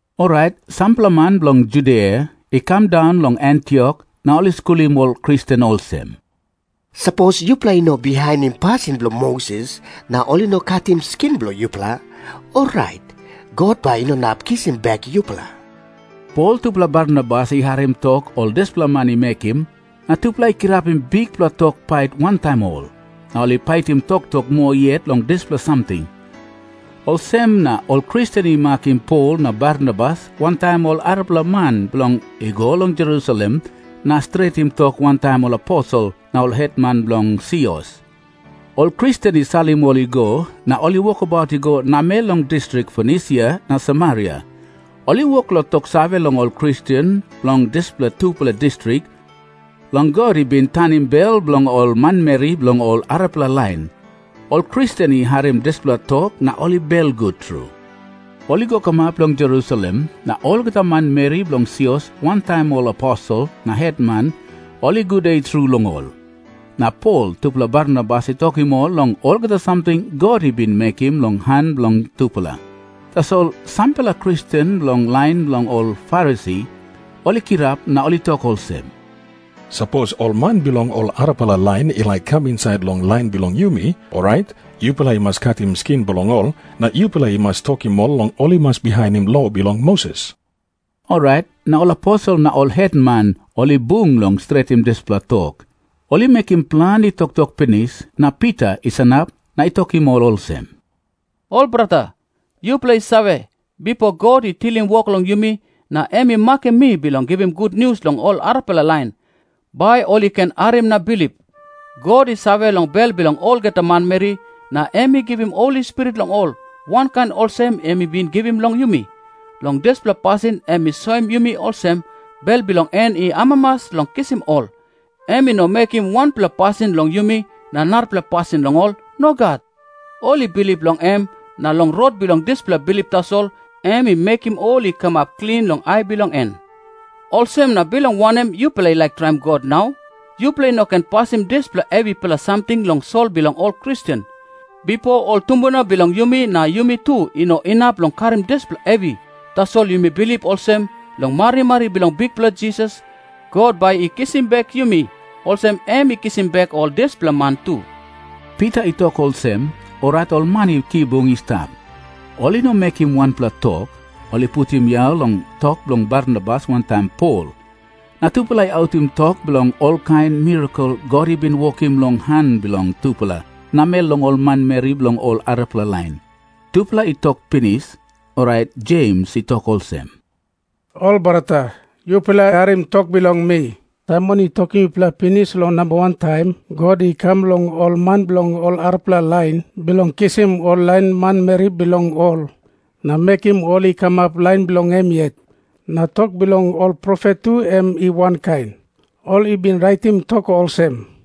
Orait sampela man bilong Judia i kam daun long Antiok na ol i skulim ol Kristen olsem, "Sapos yupela i no bihainim pasin bilong Moses na ol i no katim skin bilong yupela, orait God bai i no inap kisim bek yupela." Pol tupela Barnabas i harim tok ol dispela man i mekim, na tupela i kirapim bikpela tok pait wantaim ol, na ol i paitim toktok moa yet long dispela samting. Olsem na ol Kristen i makim Pol na Barnabas wantaim ol arapela man bilong i go long Jerusalem na stretim tok wantaim ol aposel na ol hetman bilong sios. Ol Kristen i salim ol i go, na ol i wokabaut i go namel long distrik Fonisia na Samaria. Ol i wok long toksave long ol Kristen bilong dispela tupela distrik, long God i bin tanim bel bilong ol manmeri bilong ol arapela lain. Ol Kristen i harim dispela tok na ol belgut tru. Ol i go kamap long Jerusalem, na olgeta manmeri bilong sios wantaim ol aposel na hetman ol i gude tru long ol. Na Pol tupela Barnabas i tokim ol long olgeta samting God i bin mekim long han bilong tupela. Tasol sampela Kristen bilong lain bilong ol Farisi ol i kirap na ol i tok olsem, "Sapos ol man bilong ol arapela lain i laik kam insait long lain bilong yumi, orait yupela i mas katim skin bilong ol, na yupela i mas tokim ol long ol i mas bihainim lo bilong Moses." Orait na ol aposel na ol hetman ol i bung bilong stretim dispela tok. Ol i mekim planti toktok pinis, na Pita i sanap na i tokim ol olsem, "Ol brata, yupela i save, bipo God i tilim wok long yumi, na em i makim mi bilong givim gutnius long ol arapela lain, bai ol i ken harim na bilip. God i save long bel bilong olgeta manmeri, na em i givim Holi Spirit long ol, wankain olsem em i bin givim long yumi. Long dispela pasin em i soim yumi olsem, bel bilong en i amamas long kisim ol. Em i no mekim wanpela pasin long yumi na narapela pasin long ol. Nogat. Ol i bilip long em, na long rot bilong dispela bilip tasol em i mekim ol i kamap klin long ai bilong en. Olsem na bilong wanem yupela i laik traim God nau? Yupela i no ken pasim dispela hevipela samting long sol bilong ol Kristen. Bipo ol tumbuna bilong yumi na yumi tu i no inap long karim dispela hevi. Tasol yumi bilip olsem, long marimari bilong Bikpela Jisas, God bai i kisim bek yumi, olsem em i kisim bek ol dispela man tu." Pita i tok olsem, orait ol man i kibung i stap, ol i no mekim wanpela tok. Ol i putim yau long tok bilong Barnabas wantaim Pol. Na tupela i autim tok bilong olkain mirakel God i bin wokim long han bilong tupela namel long ol manmeri bilong ol arapela lain. Tupela i tok pinis, orait Jems i tok olsem, "Ol brata, yupela harim tok bilong mi. Saimon i tokim yupela pinis long namba wan taim God i kam long ol man bilong ol arapela lain, bilong kisim ol lain manmeri bilong ol na mekim ol i kamap lain bilong em yet. Na tok bilong ol profet tu em i wankain. Ol i bin raitim tok olsem,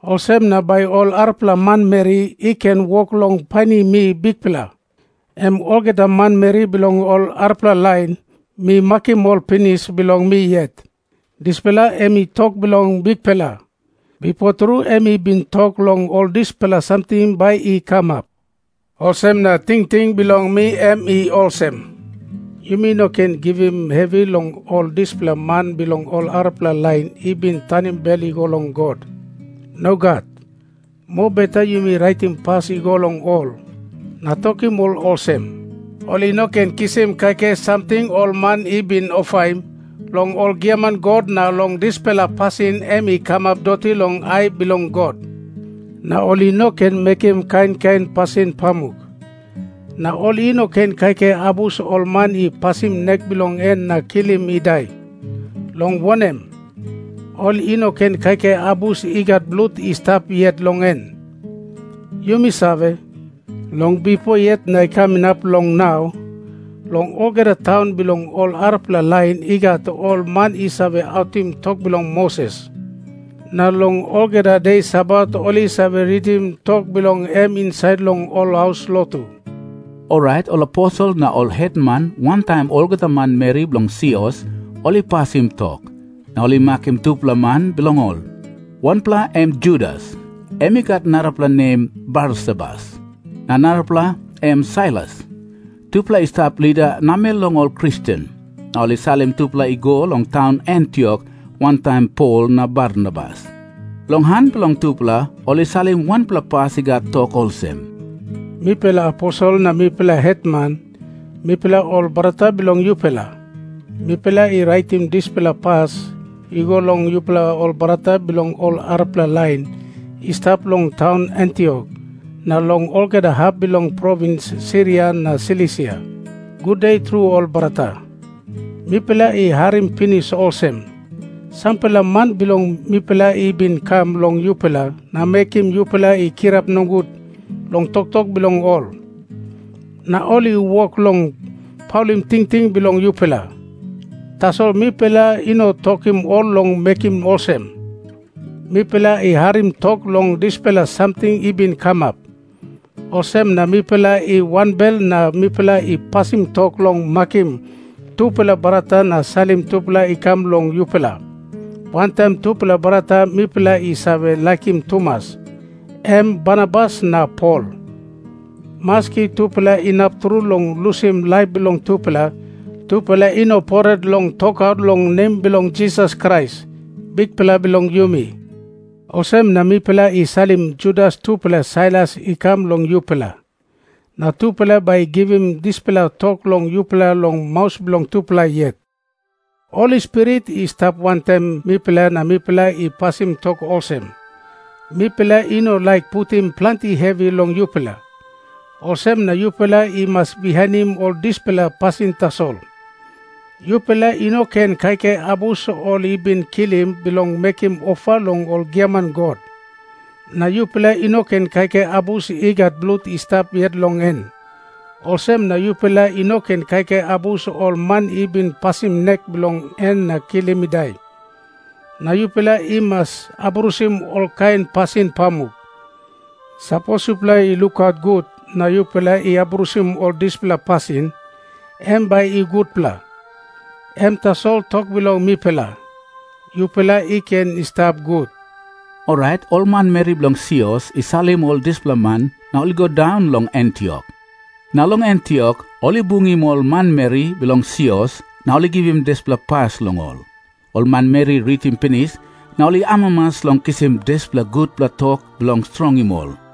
Olsem na bai ol arapela manmeri i ken wok long painim mi Bikpela. Em olgeta manmeri bilong ol arapela lain, mi makim ol pinis bilong mi yet." Dispela em i tok bilong Bikpela. Bipo tru em i bin tok long ol dispela samting bai i kamap.' "Olsem na tingting bilong mi em i olsem. Yumi no ken givim hevi long ol dispela man bilong ol arapela lain i bin tanim bel i go long God. Nogat. Mobeta yumi raitim pas i go long ol, na tokim ol olsem, ol i no ken kisim kaikai samting ol man i bin ofaim long ol giaman god na long dispela pasin em i kamap doti long ai bilong God. Na ol i no ken mekim ol kain kain pasin pamuk. Na ol i no ken kaikai abus ol man i pasim nek bilong en na kilim i dai, long wanem, ol i no ken kaikai abus i gat blut i stap yet long en. Yumi save, long bipo yet na i kam inap long nau, long olgeta taun bilong ol arapela lain i gat ol man i save autim tok bilong Moses. Na long olgeta de Sabat ol i save ritim tok bilong em insait long ol haus lotu." Orait ol aposel na ol hetman wantaim olgeta manmeri bilong sios ol i pasim tok, na ol i makim tupela man bilong ol. Wanpela em Judas, em i gat narapela nem Barsabas, na narapela em Sailas. Tupela i stap lida namel long ol Kristen. Na ol i salim tupela i go long taun Antiok wantaim Pol na Barnabas. Long han bilong tupela ol i salim wanpela pas i gat tok olsem, "Mipela aposel na mipela hetman, mipela ol brata bilong yupela, mipela i raitim dispela pas i go long yupela ol brata bilong ol arapela lain i stap long taun Antiok na long olgeta hap bilong provins Siria na Silisia. Gude tru ol brata. Mipela i harim pinis olsem, sampela man bilong mipela i bin kam long yupela na mekim yupela i kirap nogut long toktok bilong ol. Na ol i wok long paulim tingting bilong yupela. Tasol mipela i no tokim ol long mekim olsem. Mipela i harim tok long dispela samting i bin kamap, olsem na mipela i wanbel na mipela i pasim tok long makim tupela brata na salim tupela i kam long yupela, wantaim tupela brata mipela i save laikim tumas, em Barnabas na Pol. Maski tupela inap tru long lusim laip bilong tupela, tupela i no pret long tokaut long nem bilong Jisas Krais, Bikpela bilong yumi. Olsem na mipela i salim Judas tupela Sailas i kam long yupela, na tupela bai i givim dispela tok long yupela long maus bilong tupela yet. Holi Spirit i stap wantaim mipela na mipela i pasim tok olsem, mipela i no laik putim planti hevi long yupela. Olsem na yupela i mas bihainim ol dispela pasin tasol. Yupela i no ken kaikai abus ol i bin kilim bilong mekim ofa long ol giaman god. Na yupela i no ken kaikai abus i gat blut i stap yet long en, olsem na yupela i no ken kaikai abus ol man i bin pasim nek bilong en na kilim i dai. Na yupela i mas abrusim olkain pasin pamuk. Sapos yupela i lukaut gut na yupela i abrusim ol dispela pasin, em bai i gutpela. Em tasol tok bilong mipela. Yupela i ken i stap gut." Orait ol manmeri bilong sios i salim ol dispela man na ol i go daun long Antiok. Na long Antiok ol i bungim ol manmeri bilong sios na ol i givim dispela pas long ol. Ol manmeri i ritim pinis, na ol i amamas long kisim dispela gutpela tok bilong strongim ol.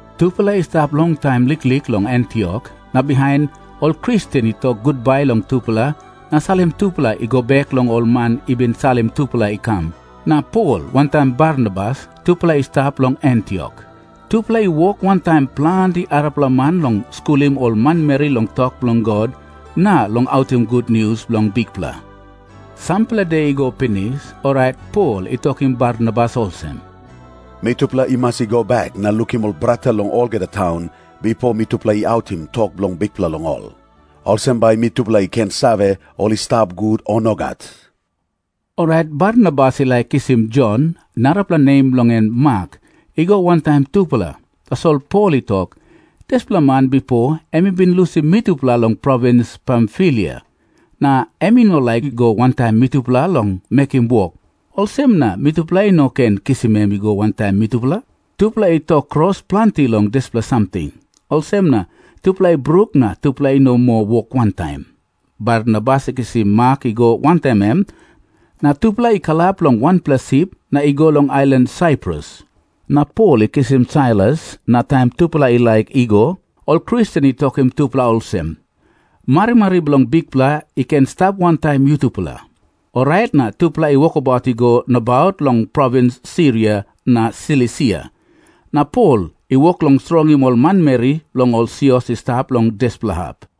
Tupela i stap longtaim liklik long Antiok, na bihain ol Kristen i tok gutbai long tupela na salim tupela i go bek long ol man i bin salim tupela i kam. Na Pol wantaim Barnabas tupela i stap long Antiok. Tupela i wok wantaim planti arapela man long skulim ol manmeri long tok bilong God na long autim gutnius bilong Bikpela. Sampela de i go pinis, orait Pol i tokim Barnabas olsem, "Mitupela i mas i go bek na lukim ol brata long olgeta taun, bipo mitupela i autim tok bilong Bikpela long ol. Olsem bai mitupela i ken save, ol i stap gut, o nogat." Orait Barnabas i laik kisim Jon, narapela nem bilong en Mak, i go wantaim tupela. Tasol Pol i tok, "Dispela man bipo em i bin lusim mitupela long provins Pamfilia, na em i no laik i go wantaim mitupela long mekim wok, olsem na mitupela i no ken kisim em i go wantaim mitupela." Tupela i tok kros planti long dispela samting. Olsem na tupela i bruk na tupela i no moa wok wantaim. Barnabas i kisim Mak i go wantaim em, na tupela i kalap long wanpela sip na i go long ailan Saiprus. Na Pol i kisim Sailas. Na taim tupela i laik i go, ol Kristen i tokim tupela olsem, "Marimari bilong Bikpela i ken i stap wantaim yutupela." Orait na tupela i wokabaut i go nabaut long provins Siria na Silisia, na Pol i wok long strongim ol manmeri bilong ol sios i stap long dispela hap.